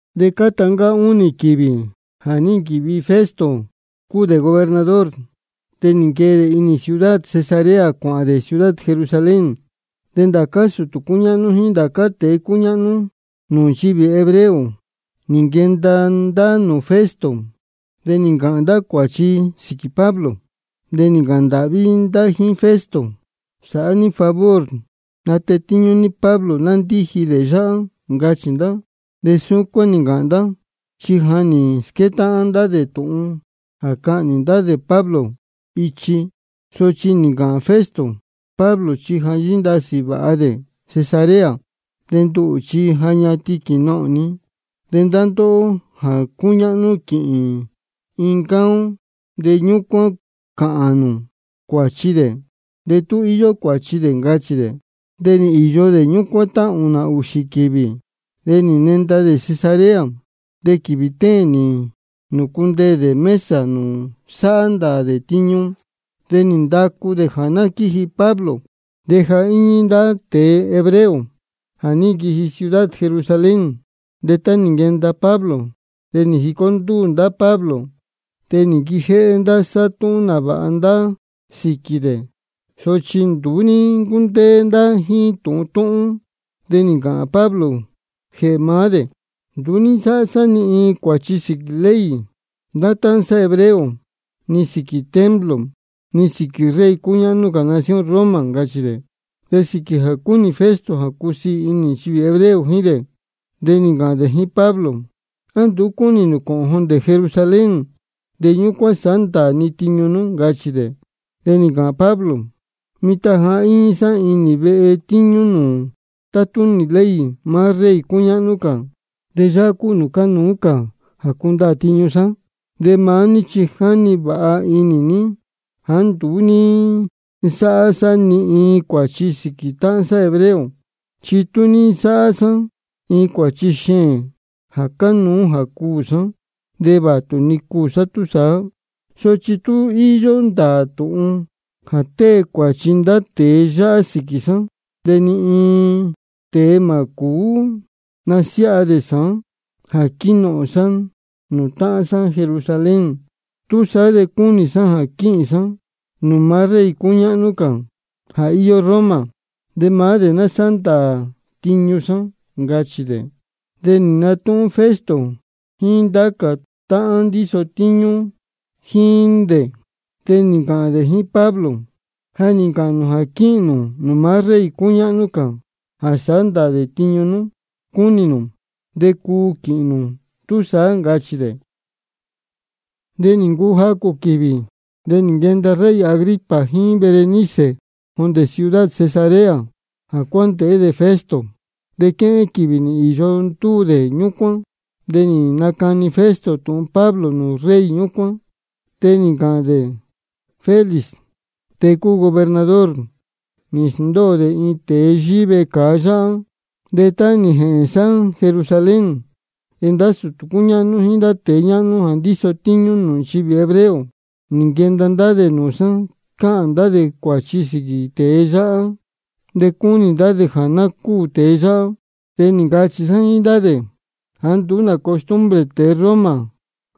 De cáta ncáá únī-ni quīvī jā ní nquīvi Festo cúu dē gobernador de nī nquee dē inī ciudad Cesarea cuāhān dē ciudad Jerusalén. De ndācá sūtū cúñáhnú jíín ndācá tēe cúñáhnú nūū nchivī hebreo, nī nquenda ndá nūū Festo, de nī ncāhān ndá cuāchi sīquī Pablo. De nī ncāhān ndāhví ndá jíín Festo: Sāhá ní favor natetíñú ní Pablo ná ndíji dē yáhá, ncachī ndá. De súcuán nī ncāhān ndá, chi ja nī squétáhán ndá tūhun jā cahnī ndá Pablo ichi. Sochi nī ncāhān Festo: Pablo chi ja yíndasī vāha dē Cesarea, de nduhū chi ja ñatin quīnohōn ni. De ndá ndóhó jā cúñáhnú quīhīn iin ncáá ó, de ñúcuán cāhān nū cuāchi dē de tú íyó cuāchi dē, ncachī dē. De nī īyo dē ñúcuán tá ūnā á ūxī-ni quīvī, de nī nenda dē Cesarea. De quīvī téēn nī nūcundeē dē mesa nūū sáhá ndāā dē tiñu, de nī ndacu dē jā ná quíji Pablo. De ja íñí ndá tēe hebreo jā ní nquiji ciudad Jerusalén. De tá nī nquenda Pablo de nī jicó ndúū ndá Pablo, de nī nquijéhé ndá sáhá túhún nāvāha ndá sīquī dē. Sochi nduú ní ncúndéé ndá jíín tūhun túhún. De nī ncāhān Pablo jēhē maá dē: Nduú ní nsáhá sá ni iin cuāchi sīquī ley ndá táhán sá hebreo ni sīquī templo ni sīquī rey cúñáhnú cā nación Roma, ncachī dē. De sīquī jā cúnī Festo jā cusiī inī nchivī hebreo jíín dē de nī ncāhān dē jíín Pablo: ¿A nduú cúnī nū cōhōn jondē Jerusalén, de ñúcuán sāhá ndāā ni tiñu nú? ncachī dē. De nī ncāhān Pablo: Mitan ja íñí sá inī vehe tíñú nūū tátúnī ley maá rey cúñáhnú cā, de yáhá cúu nūū cánuú jā cundaā tiñu sá. De maá ní chi ja jínī vāha ní jāá nduú ní nsáhá sá ni iin cuāchi sīquī táhán sá hebreo. Chi tú ní nsáhá sá iin cuāchi xeēn jā cánuú jā cuū sá de vātu-ni cuū sá túsaá. Sochi tú nduú íyó ndāā tūhun jā tée cuāchi ndá tēe yáhá sīquī sá de ni iin tēe mā cūú nasiáha dē sāán jā quínohōn sá nūū táhán sá Jerusalén. Túsaá de cúnī sá jā quīhīn sá nūū maá rey cúñáhnú cā jā íyó Roma de maá dē ná sáhá ndāā tiñu sá, ncachī dē. De nī natúhún Festo jíín ndá cā táhán ndíso tíñú jíín dē. De nī ncāhān dē jíín Pablo: Ja nī ncāhān nū jā quíhīn nū nūū maá rey cúñáhnú cā jā sāhá ndāā dē tiñu nú cúnī nū. De cuu de quīhīn nū túsaá, ncachī dē. De nī ncuu jacū quīvī, de nī nquenda rey Agripa jíín Berenice jondē ciudad Cesarea jā cuándēhé dē Festo. De quéhén quīvī nī īyo ndúū dē ñúcuán. De nī nacani Festo tūhun Pablo nūū rey ñúcuán, chi nī ncāhān dē: Félix, tēe nī ncuu gobernador, nī sndóo dē iin tēe yíhí vecāa yáhá. De tá nī jēhēn sá Jerusalén de ndá sūtū cúñáhnú jíín ndá tēe ñáhnú jā ndíso tíñú nūū nchivī hebreo nī nquenda ndá dē nūū sá cáhān ndá dē cuāchi sīquī tēe yáhá, de cúnī ndá dē jā ná cúū tēe yáhá. De nī ncachī sá jíín ndá dē jāá nduú nā costumbre tēe Roma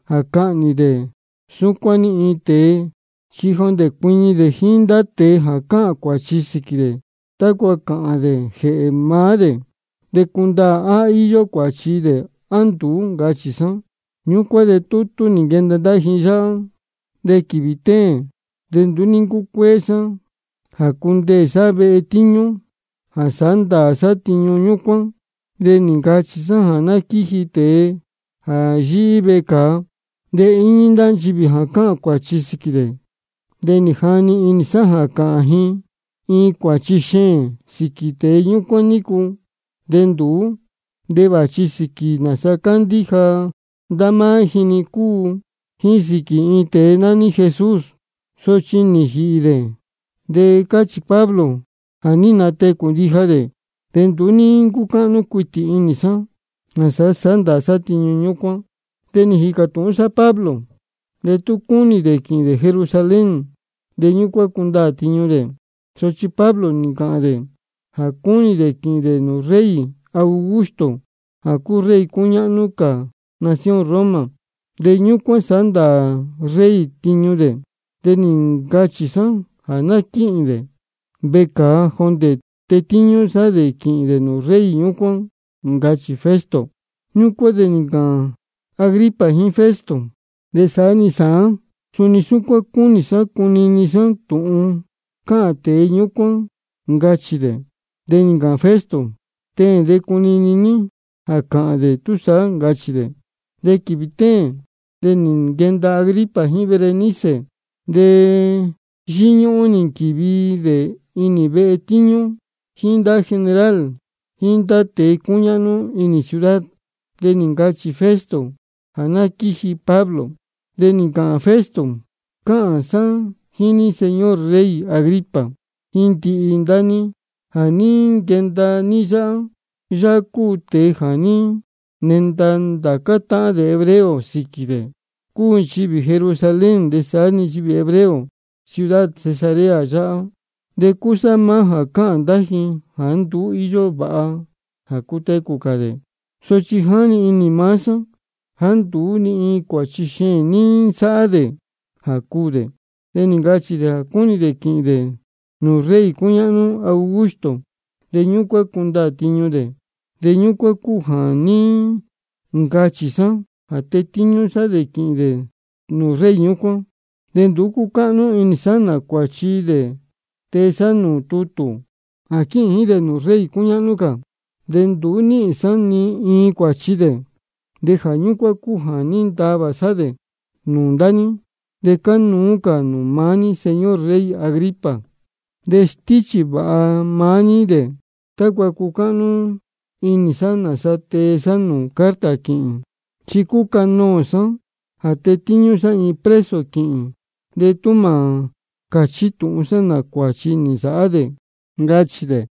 jā cahnī dē súcuán-ni iin tēe chi jondē cuiñi dē jíín ndá tēe jā cáhān cuāchi sīquī dē, tácua cāhān dē jēhē maá dē de cundaā á íyó cuāchi dē á nduú, ncachī sá. Ñúcuán de tútú nī nquenda ndá ji yáhá. De quīvī téēn de nduú ní ncúcuéé sá jā cundeē sá vehe tíñú jā sāhá ndāā sá tiñu ñúcuán, de nī ncachī sá jā ná quíji tēe jā yíhí vecāa. De íñí ndá nchivī jā cáhān cuāchi sīquī dē. De nī jani inī sá jā cāhān ji iin cuāchi xeēn sīquī tēe ñúcuán nícu, de nduú. Chi vāchi sīquī nāsa cándíja ndá máá ji-ni cúu, jíín sīquī iin tēe nání Jesús, sochi ja nī jīhī dē, de cáchī Pablo jā ní natecū ndija dē. De nduú ní ncúcáhnú cuitī inī sá nāsa sāhá ndāā sá tiñu ñúcuán. De nī jīcā tūhún sá Pablo de tú cúnī dē quīhīn dē Jerusalén de ñúcuán cundaā tiñu dē. Sochi Pablo nī ncachī dē jā cúnī dē quīhīn dē nūū rey Augusto jā cúu rey cúñáhnú cā nación Roma, de ñúcuán sāhá ndāā rey tiñu dē. De nī ncachī sá jā ná quíhi dē vecāa jondē tetíñú sá dē quīhīn dē nūū rey ñúcuán, ncachī Festo. Ñúcuán de nī ncāhān Agripa jíín Festo: De saá-ni sāán suni cúnī sá jā cunini sá tūhun cāhān tēe ñúcuán, ncachī dē. De nī ncāhān Festo: Teēn de cunini ní jā cāhān dē túsaá, ncachī dē. De quīvī téēn de nī nquenda Agripa jíín Berenice. De yíñúhún nī nquīvi dē inī vehe tíñú jíín ndá general jíín ndá tēe cúñáhnú inī ciudad. De nī ncachī Festo jā ná quíji Pablo. De nī ncāhān Festo: Cáhān sá jíín ní, señor rey Agripa, jíín ndihi ndá ní jā ní nquenda ní yáhá. Yáhá cúu tēe jā ní nenda ndācá táhán dē hebreo sīquī dē, cúu nchivī Jerusalén de saá-ni nchivī hebreo ciudad Cesarea yáhá, de cúsá maá jā cáhān ndá ji jāá nduú íyó vāha jā cutecū cā dē. Sochi jáni inī maá sá jā nduú ni iin cuāchi xeēn ní nsáhá dē jā cuū dē. De nī ncachī dē jā cúnī dē quīhīn dē nūū rey cúñáhnú Augusto, de ñúcuán cundaā tiñu dē. De ñúcuán cúu jā ní ncachī sá jā tetíñú sá dē quīhīn dē nūū rey ñúcuán. De nduú cúcáhnú inī sá nā cuāchi dē tee sá nūū tutū jā quíhīn jíín dē nūū rey cúñáhnú cā, chi nduú níhīn sá ni iin cuāchi dē. De jā ñúcuán cúu jā ní ntavā sá dē nūū ndá ní, de cánuú cā nūū maá ní, señor rey Agripa. De stíchī vāha maá ní dē tácua cucáhnú inī sá nāsa tee sá carta quīhīn. Chi cúcanōō sá jā tetíñú sá iin preso quīhīn de tú mā cāchí tūhun sá nā cuāchi nī nsāhá dē, ncachī dē.